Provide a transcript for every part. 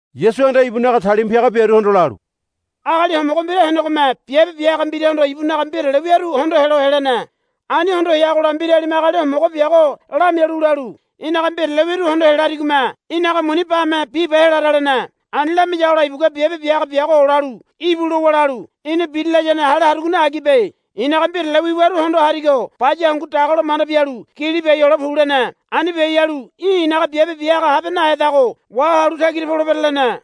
Yasuhanda ibunaga talima piaga biaruhondo lalu, Agali homogo mbira henegome biabe bia haga mbirahondo ibunaga mbirale wiaru hondo helo helene. Ani hondo heagola mbiralime agali homogo biago lamialu lalu, Í̠naga mbirale wiru hondo helariyagome í̠naga muni bame biba helara, lene. Ani lamiyagola ibugua biabe bia haga biago olalu, Íbu, lowa lalu, Í̠na biri layane hale harugo agibe. I̱naga mbirale wiwaru hondo harigo baya hangu dagalo manda bialu gili biai hole pu, lene. Ani biai halu í̠ i̱naga biabe bia haga habe nahedago wahalu tagira polebere, lene.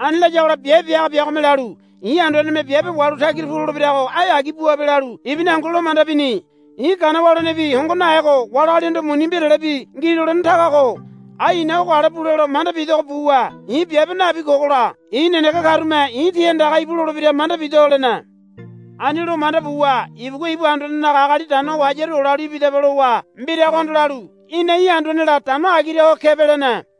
Ani layagola biabe bia haga biagome lalu, I̱ anduaneme i̱ biabe wahalu tagira pu lolebirago ai agi buabe, lalu ibuni hangu lo manda bini. I̱ gana walenebi hongo nahego wali agalihondo muni mbiralebi ngi lolene taga ko. Ai i̱na ogo ale bule lo manda bidogo buwa i̱ biabe nabi kogola i̱ nenege karume i̱ ti andaga, Íbu, lolebira manda bido, lene. Ani lo manda buwa ibugua ibu anduanenaga agali dano ho hayaru olalu, Ibidaba, lowa mbiragohondo lalu, Í̠na i̱ anduanela dano agira ho kebe, lene.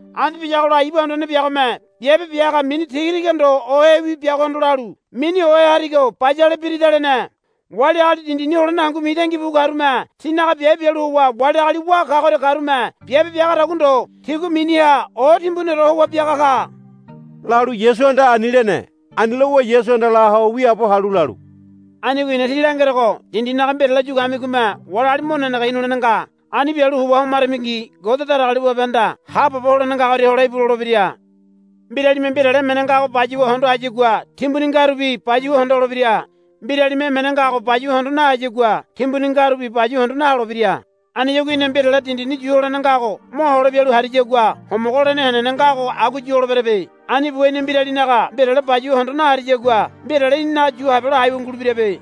Ani biyagola ibu anduane biagome biabe bia haga mini tigatiga ndo ohewi biagohondo lalu, Mini ohe harigo bayale birida, lene. Wali agali dindini holene hangu mitangi bu karume tinaga biabe bialu howa wali agali wá kagoria karume biabe biagadagua ndo tigua miniha o timbuniore howa biaga ka, lalu Yasuhanda ani lene. Ani lowa Yasuhanda la ho wiaabo halu lalu, Anigo i̱na tí langerogo dindinaga mbirale yu kamigome wali agali mo nenege hinulene nga. Ani bialu howa homaramingi Ngode Datagaliwabehanda haabobo holene ngagoria, Hole íbu, lolebira. Mbiralime mbirale emene ngago bayuwa hondo hayagua timbuni ngarubi bayuwa hondo holebira. Mbiralime emene ngago bayuwa hondo nahayagua timbuni ngarubi bayuwa hondo naholebira. Aniyagua í̠na mbirale dindi yu holene ngago mohole bialu hariyagua homogo holene henene ngago agua yu holeberebe. Ani buwa í̠na mbiralinaga mbirale bayuwa hondo nahariyagua mbirale í̠ninaga yu habelo aiwa ngulebirabe.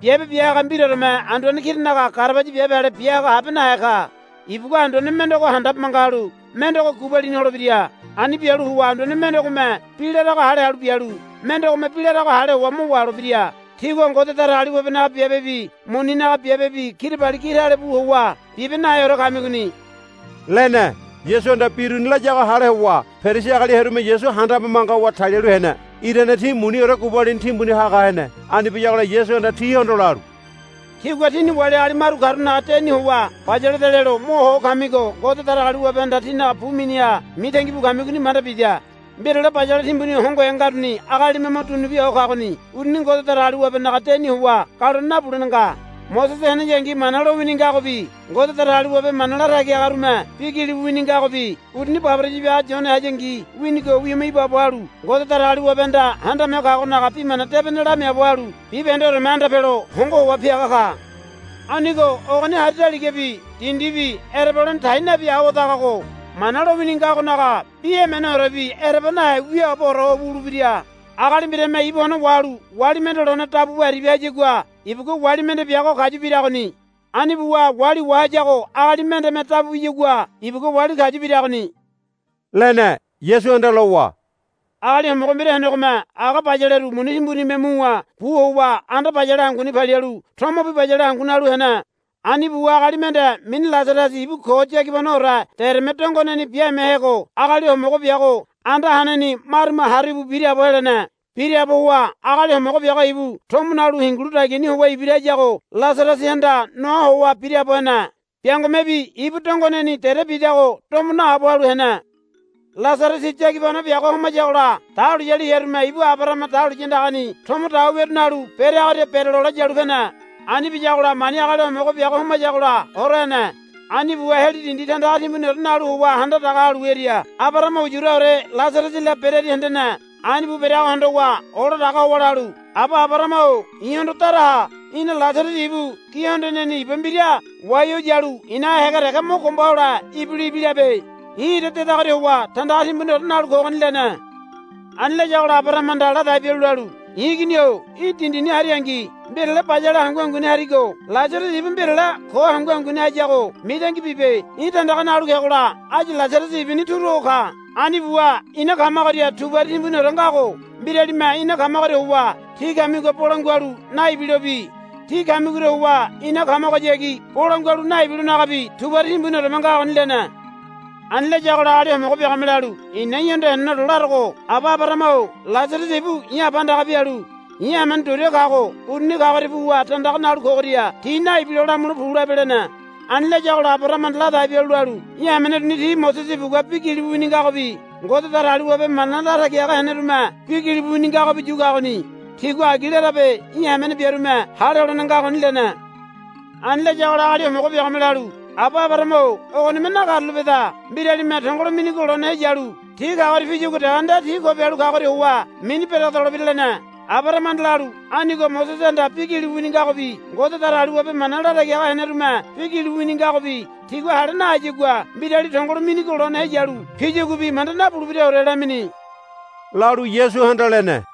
Biabe bia haga mbiraoreme anduane kiranaga garabaya biabe ale bia haga habe nahe ka. Ibugua anduane mendego handabe manga halu mendego gubalini holebira. Ani bialu howa anduane mendegome bi larago hale halu bialu mendegome bi larago hale howa mo waholebira. Tígua Ngode Datagaliwabenaga biabebi muninaga biabebi kirabali gi tale bu howa bibe naheore kamigoni, lene. Yasuhanda bi uruni layago hale howa Perisi agali hearume Yasu handabe manga howa talialu hene. Irane ti muniore gubalini timbuni haga hene. Ani biyagola Yasuhanda tihondo lalu, Tígua tíni wali agali maru karunaga deni howa, Bayaleda, lelo mo ho kamigo Ngode Datagaliwabehanda tínaga bu miniha mitangi bu kamigoni manda bida. Mbirale bayale timbuni hongohe ngaruni agalime mo dunu bia ho kagoni uruni Ngode Datagaliwabenaga deni howa galone nabulene nga. Mosese heneyangi Mana lowini ngagobi Ngode Datagaliwabe mana latagi hagarume bi gilibu wini ngagobi uruni baboraya biaga Yone hayangi winigo wima ibaabo halu Ngode Datagaliwabehanda Handame Ho Kagonaga Bi Mana Debene lamiaabo halu bibahendeoreme anda pelo hongo howa piaga ka. Anigo ogoni hari daligabi dindibi ereba holene tai nabi awadagago Mana lowini ngagonaga bi emeneorebi ereba nahe wiaaboore ho wulebira. Agali mbirame ibu one wahalu wali mende lone dabu bu aribia hayagua ibugua wali mende biago kayu biragoni. Ani buwa wali wahayago agali mendeme dabu biyagua ibugua wali kayu biragoni, lene. Yasuhanda lowa, Agali homogo mbira henegome aga bayaleru muni timbunime muwa bu howa anda bayale hanguni palialu tomobi bayale hangu nalu hene. Ani buwa agali mende mini Lasarasi ibu ko yagibanoore dereme dongoneni biamehego agali homogo biago anda haneni marume haru íbu biraabo helene. Biraabo howa agali homogo biago ibu tomo nalu hingilu dagiani howa ibira hayago Lasarasihanda noa howa biraabo hene. Biangomebi ibu dongoneni dere bidago domo naabo halu hene. Lasarasi yagibano biago homayagola dahuliyali hearume ibu Abarahama dahuliya andagani tomo dawa wiaru nalu bereagoria berelole yalu pene. Ani biyagola mani agali homogo biago homayagola hora hene. Ani buwa Heli dindi tandaga timbuniore nalu howa handa daga halu hearia Abarahama uyuraore Lasarasila berearia hendene. Ani bu bereago hondowa ola daga howa lalu, Aba Abarahama-o i̱hondo dara ha. Í̠na Lasarasi ibu gi hondoneni iba mbira wai ho yalu i̱naga hége dege mo gomba hole ibilo ibilabe. I̱ ira dedagoria howa tandaga timbuniore nalu kogoni, lene. Ani layagola Abarahamahanda ladai bialu lalu, I̱ igini-o í̠ dindini haringi mbirale bayale hangu hanguni harigo Lasarasi ibu mbirale ko hangu hanguni hayago mitangi bibe. Í̠ tandaga nalu kegola áyu Lasarasi ibuni turu ho ka. Ani buwa ina kamagoria tubari timbuniore ngago mbiralime ina kamagoria howa tí kamigoha bolangua halu naibilobi tí kamigoria howa ina kamagohayagi bolangua halu naibilonagabi tubari timbunioreme ngagoni, lene. Ani layagola agali homogo biagome lalu, I̱na í̠hondo heneneore larogo aba Abarahama-o Lasarasi ibu i̱ aba andaga pialu i̱ hamene duria kago uruni kagoria puwa tandaga nalu kogoria ti naibilo lamule pu labe, lene. Ani layagola Abarahamahanda ladai bialu lalu, Í̠ hamene uruni ti Mosese ibugua bi gilibu wini ngagobi Ngode Datagaliwabe mana latagi haga henerume bi gilibu wini ngagobi yu kagoni. Tigua agi larabe í̠ hamene biarume hale holene ngagoni, lene. Ani layagola agali homogo biagome lalu, Aba Abarahama-o ogonime nakarulapeda. Mbiralime tongolo minigo lone heyalu ti kagoria piyagua dege nde ti ko bialu hayagoria howa mini beregedolebira, lene. Abarahamahanda lalu, Anigo Mosesehanda bi gilibu wini ngagobi Ngode Datagaliwabe mana latagi haga henerume bi gilibu wini ngagobi tigua hale nahayagua mbirali tongolo minigo lone heyalu piyaguabi manda nabulebiraore, lamini, lalu Yasuhanda lene.